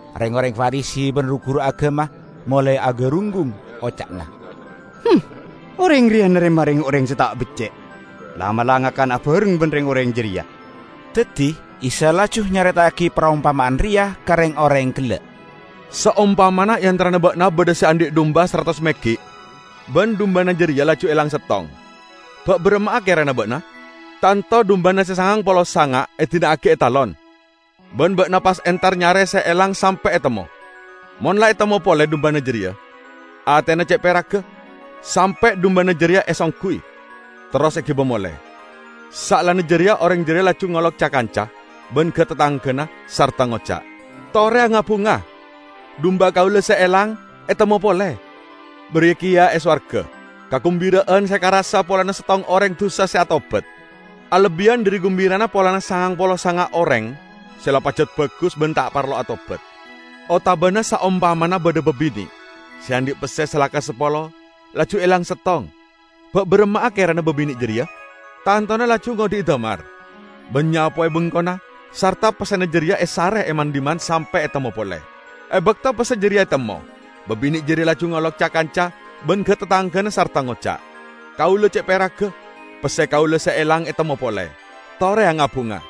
Reng-oreng Farisi ban ru-guru agama molae agarunggung. Oca'na, "Oreng reya narema reng-oreng se ta' becce', la'-mala' ngakan abareng ban reng-oreng jareya." Daddi Isa laju nyareta'agi parompama'an reya ka reng-oreng gella'. "Saompamana e antarana ba'na badha se andhi' dumba saratos meggi', ban dumbana jareya laju elang settong -- ba' baramma'a kerana ba'na? Tanto dumbana se sangang polo sanga' edina'agi e talon, ban ba'na pas entar nyare se elang sampe' etemmo. Mon la etemmo pole dumbana jareya, atena ce' peragga, sampe' dumbana jareya esongguy, terros egiba mole. Saellana jareya oreng jareya laju ngolok ca-kanca ban ga-tatanggana, sarta ngoca', 'Tore anga-bunga. Dumba kaula se elang etemmo pole!' Bariya keya e sowarga, kagumbira'an se ekarassa polana settong oreng dusa se atobat alebbiyan dhari gumbirana polana sangang polo sanga' oreng se la pajat bagus ban ta' parlo atobat." "Otabana saompamana badha babine' se andhi' pesse salaka sapolo, laju elang settong -- ba' baramma'a kerana babine' jareya? Tantona laju ngodhi'i damar ban nyapowe bengkona sarta pessena jareya esare e man-dhimman sampe' etemmo pole. E bakto pesse jareya etemmo, babine' jareya laju ngolok ca-kanca ban ga-tatanggana, sarta ngoca', 'Kaula ce' peragga; pesse kaula se elang etemmo pole. Tore anga-bunga!'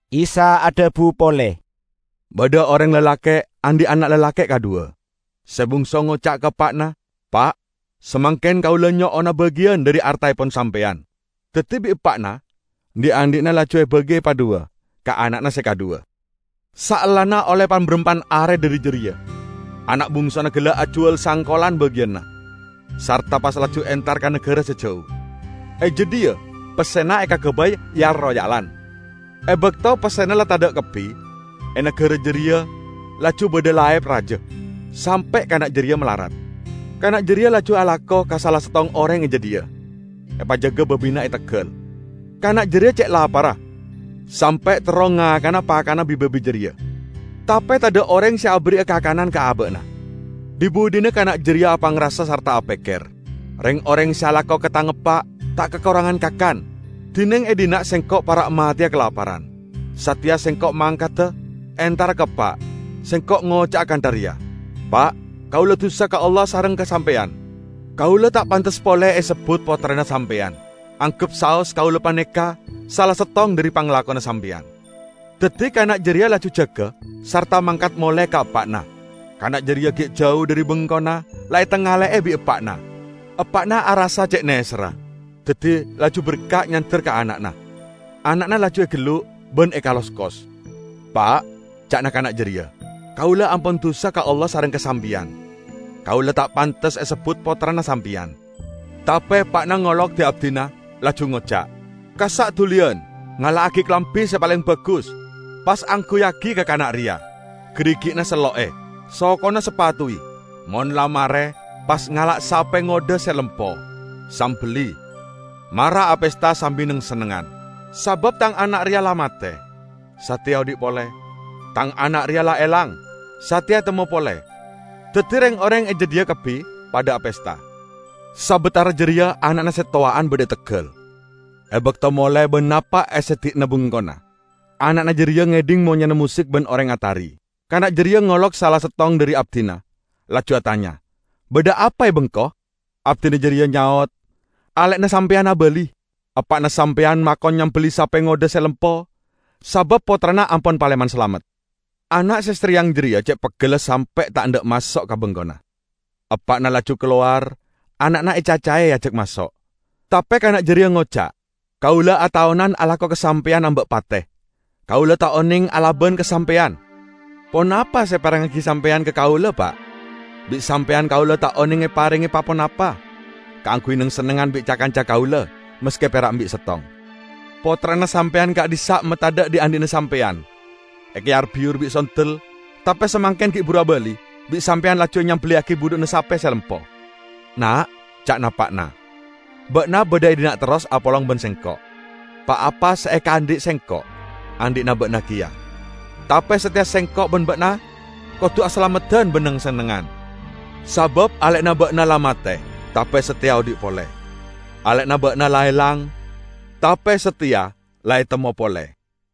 Isa adhabu pole, "Badha oreng lalake' andhi' ana' lalake' kadhuwa. Se bungso ngoca' ka eppa'na, 'Pa', samangken kaula nyo'ona bagiyan dhari artaepon sampeyan.' Daddi bi' eppa'na dhi'-andhi'na laju ebagi epadhuwa ka ana'na se kadhuwa. Saellana olle pan-barampan are dhari jareya ana' bungsona gella' ajuwal sangkolan bagiyanna, sarta pas laju entar ka nagara se jau. E jadhiya pessena ekagabay yal-royalan. E bakto pessena la tadha' kabbi, e nagara jareya laju badha laep raja, sampe' kana' jareya malarat. Kana' jareya laju alako ka sala settong oreng e jadhiya, epajaga babina e teggal. Kana' jareya ce' laparra, sampe' terro ngakana pakanna bi-babi jareya, tape tadha' oreng se aberri'a kakanan ka aba'na. Dhi-budhina kana' jareya apangrasa sarta apekker, 'Reng-oreng se alako ka tang eppa' ta' kakorangan kakan, dineng e dhinna' sengko' para' mateya kalaparan! Sateya sengko' mangkada entara ka eppa', sengko' ngoca'a kantha reya: Pa', kaula dusa ka Allah sareng ka sampeyan. Kaula ta' pantes pole esebbut pottrana sampeyan. Anggep saos kaula paneka sala settong dhari panglakona sampeyan.' Daddi kana' jareya laju jaga sarta mangkat mole ka eppa'na. Kana' jareya gi' jau dhari bengkona, la etangale'e bi' eppa'na. Eppa'na arassa ce' neserra, daddi laju berka' nyander ka ana'na; ana'na laju egellu' ban ekaloskos. 'Pa',' ca'na kana' jareya, 'kaula ampon dusa ka Allah sareng ka sampeyan. Kaula ta' pantes esebbut Pottrana sampeyan.' Tape eppa'na ngolok di-abdina, laju ngoca', 'Kassa' duliyan! Ngala'agi kalambi se paleng bagus, pas angguyyagi ka kana' reya. Garigi'na sello'e, sokona sapatuwi. Mon la mare pas ngala' sape ngodha se lempo, sambelli. Mara apesta sambi neng-sennengngan. Sabab tang ana' reya la mate, sateya odhi' pole; tang ana' reya la elang, sateya etemmo pole.' Daddi reng-oreng e jadhiya kabbi padha apesta. Sabatara jareya ana'na se towa'an badha e teggal. E bakto mole ban napa' e seddi'na bengkona, ana'na jareya ngedhing monyena mosik ban oreng atari. Kana' jareya ngolok sala settong dhari abdina, laju atanya, 'Badha apa e bengko?' Abdina jareya nyaot, 'Ale'na sampeyan abali! Eppa'na sampeyan makon nyambelli sape ngodha se lempo sabab pottrana ampon paleman salamet!' Ana' se sareyang jareya ce' peggella sampe' ta' endha' maso' ka bengkona. Eppa'na laju kalowar, ana'na ecacae eajak maso'. Tape kana' jareya ngoca', 'Kaula ataonan alako ka sampeyan amba' pate. Kaula ta' oneng alaban ka sampeyan. Ponapa se eparengngagi sampeyan ka kaula, Pa'? Bi' sampeyan kaula ta' oneng eparenge pa-ponapa kaangguy neng-sennengngan bi' ca-kanca kaula, maske pera' embi' settong. Pottrana sampeyan ka'dhissa' matadha' dhi'-andhi'na sampeyan, ekayar-biyur bi' sondel tape samangken gi' buru abali, bi' sampeyan laju enyambelliyagi budhu'na sape se lempo!' 'Na',' ca'na eppa'na, 'ba'na badha e dhinna' terros apolong ban sengko'. Pa-apa se ekaandhi' sengko' andhi'na ba'na keya. Tape sateya sengko' ban ba'na kodu asalameddan ban neng-sennengngan, sabab ale'na ba'na la mate tape sateya odhi' pole; ale'na ba'na la elang, tape sateya la etemmo pole.' "